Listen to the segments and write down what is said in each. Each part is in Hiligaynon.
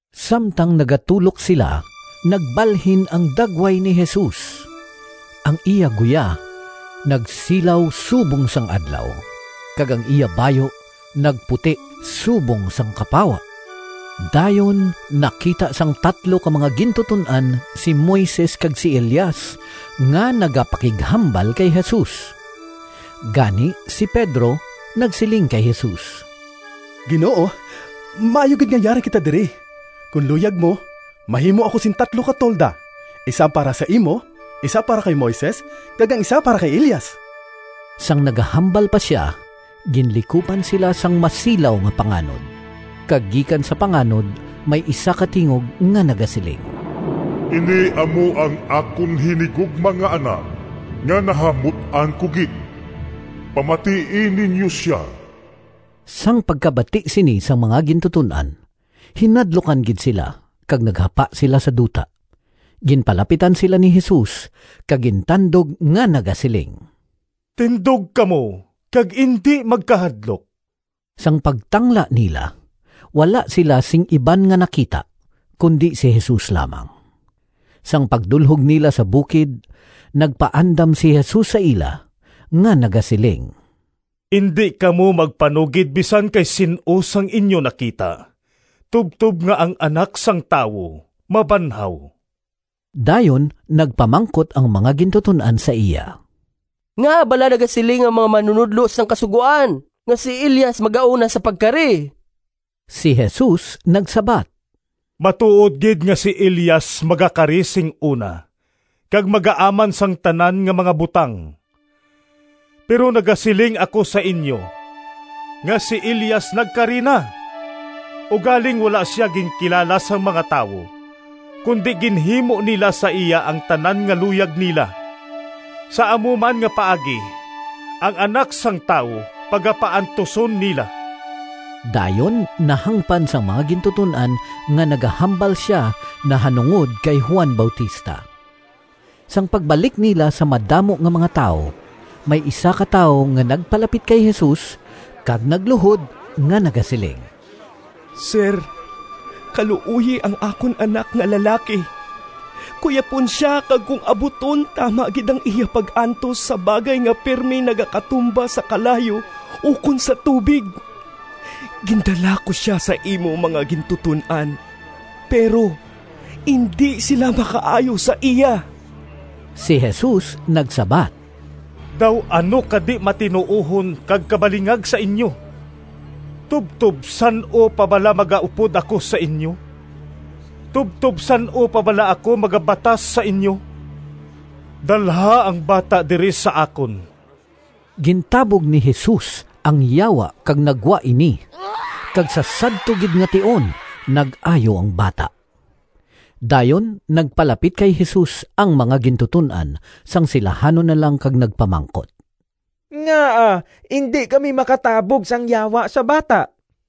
Samtang nagatulok sila, nagbalhin ang dagway ni Jesus. Ang iya guya nagsilaw subong sang adlaw, kag ang iya bayu nagputi subong sang kapawa. Dayon nakita sang tatlo ka mga gintuton-an si Moises kag si Elias nga nagapakighambal kay Jesus. Gani si Pedro nagsiling kay Jesus, “Ginoo, maayo gid nga yari kita diri. Kon luyag mo, mahimo ako sing tatlo ka tolda, isa para sa imo, isa para kay Moises, kag ang isa para kay Elias.” Sang nagahambal pa sia, ginlikupan sila sang masilaw nga panganod, kag gikan sa panganod may isa ka tingog nga nagasiling, “Ini amo ang akon hinigugma nga Anak nga nahamut-an ko gid. Pamatii ninyo sia!” Sang pagkabati sini sang mga gintuton-an, hinadlukan gid sila kag naghapa sila sa duta. Ginpalapitan sila ni Jesus kag gintandog nga nagasiling, “Tindog kamo kag indi magkahadlok!” Sang pagtangla nila, wala sila sing iban nga nakita, kundi si Jesus lamang. Sang pagdulhog nila sa bukid, nagpaandam si Jesus sa ila nga nagasiling, “Indi kamo magpanugid bisan kay sin-o sang inyo nakita, tubtob nga ang Anak sang Tawo mabanhaw.” Dayon nagpamangkot ang mga gintuton-an sa iya, “Ngaa bala nagasiling ang mga manunodlo sang Kasugoan nga si Elias magauna sa pagkari?” Si Jesus nagsabat, “Matuod gid nga si Elias magakari sing una kag magaaman sang tanan nga mga butang. Pero nagasiling ako sa inyo nga si Elias nagkari na, ugaling wala sia ginkilala sang mga tawo, kundi ginhimo nila sa iya ang tanan nga luyag nila. Sa amo man nga paagi ang Anak sang Tawo pagapaantuson nila.” Dayon nahangpan sang mga gintuton-an nga nagahambal sia nahanungod kay Juan Bautista. Sang pagbalik nila sa madamo nga mga tawo, may isa ka tawo nga nagpalapit kay Jesus, kag nagluhod nga nagasiling, “Sir, kaluoyi ang akon anak nga lalaki. Kuyapon sia kag kon abuton tama gid ang iya pag-antos sa bagay nga pirme nagakatumba sa kalayo ukon sa tubig. Gindala ko sia sa imo mga gintuton-an, pero indi sila makaayo sa iya.” Si Jesus nagsabat, “Daw ano ka di-matinuohon kag kabalingag sa inyo! Tubtob san-o pa bala magaupod ako sa inyo? Tubtob san-o pa bala ako magabatas sa inyo? Dalha ang bata diri sa akon!” Gintabog ni Jesus ang yawa kag naggwa ini, kag sa sadto gid nga tion nag-ayo ang bata. Dayon nagpalapit kay Jesus ang mga gintuton-an sang silahanon na lang kag nagpamangkot, “Ngaa indi kami makatabog sang yawa sa bata?”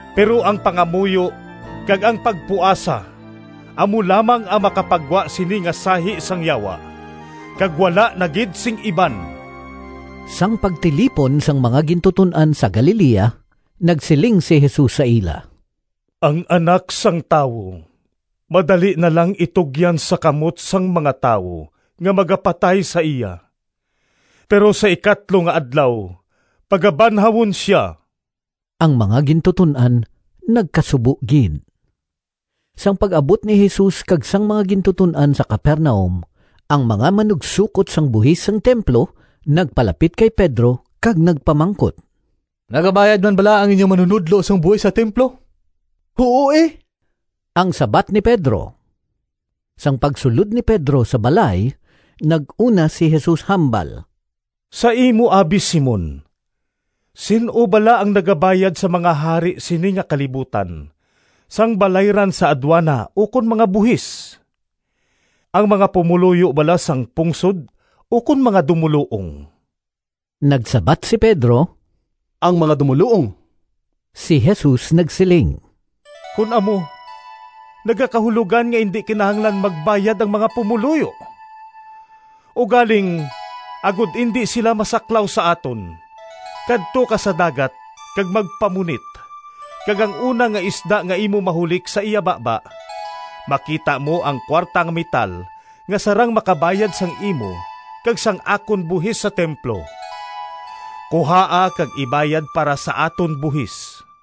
Pero ang pangamuyo kag ang pagpuasa amo lamang ang makapagwa sini nga sahi sang yawa; kag wala na gid sing iban.]” Sang pagtilipon sang mga gintuton-an sa Galilea, nagsiling si Jesus sa ila, “Ang Anak sang Tawo madali na lang itugyan sa kamot sang mga tawo nga magapatay sa iya, pero sa ikatlo nga adlaw pagabanhawon sia.” Ang mga gintuton-an nagkasubo gid. Sang pag-abot ni Jesus kag sang mga gintuton-an sa Capernaum, ang mga manugsokot sang buhis sang templo nagpalapit kay Pedro kag nagpamangkot, “Nagabayad man bala ang inyo manunodlo sang buhis sa templo?” “Huo, e!” ang sabat ni Pedro. Sang pagsulod ni Pedro sa balay, nag-una si Jesus hambal, “Sa imo abi, Simon, sin-o bala ang nagabayad sa mga hari sini nga kalibutan sang balayran sa adwana ukon mga buhis? Ang mga pumoluyo bala sang pungsod ukon mga dumoluong?” Nagsabat si Pedro, “Ang mga dumoluong.” Si Jesus nagsiling, “Kon amo nagakahulogan nga indi kinahanglan magbayad ang mga pumoluyo. Ugaling agod indi sila masaklaw sa aton, kadto ka sa dagat kag magpamunit kag ang una nga isda nga imo mahulik sa iya baba makita mo ang kuwarta nga metal nga sarang makabayad sang imo kag sang akon buhis sa templo. Kuhaa kag ibayad para sa aton buhis.”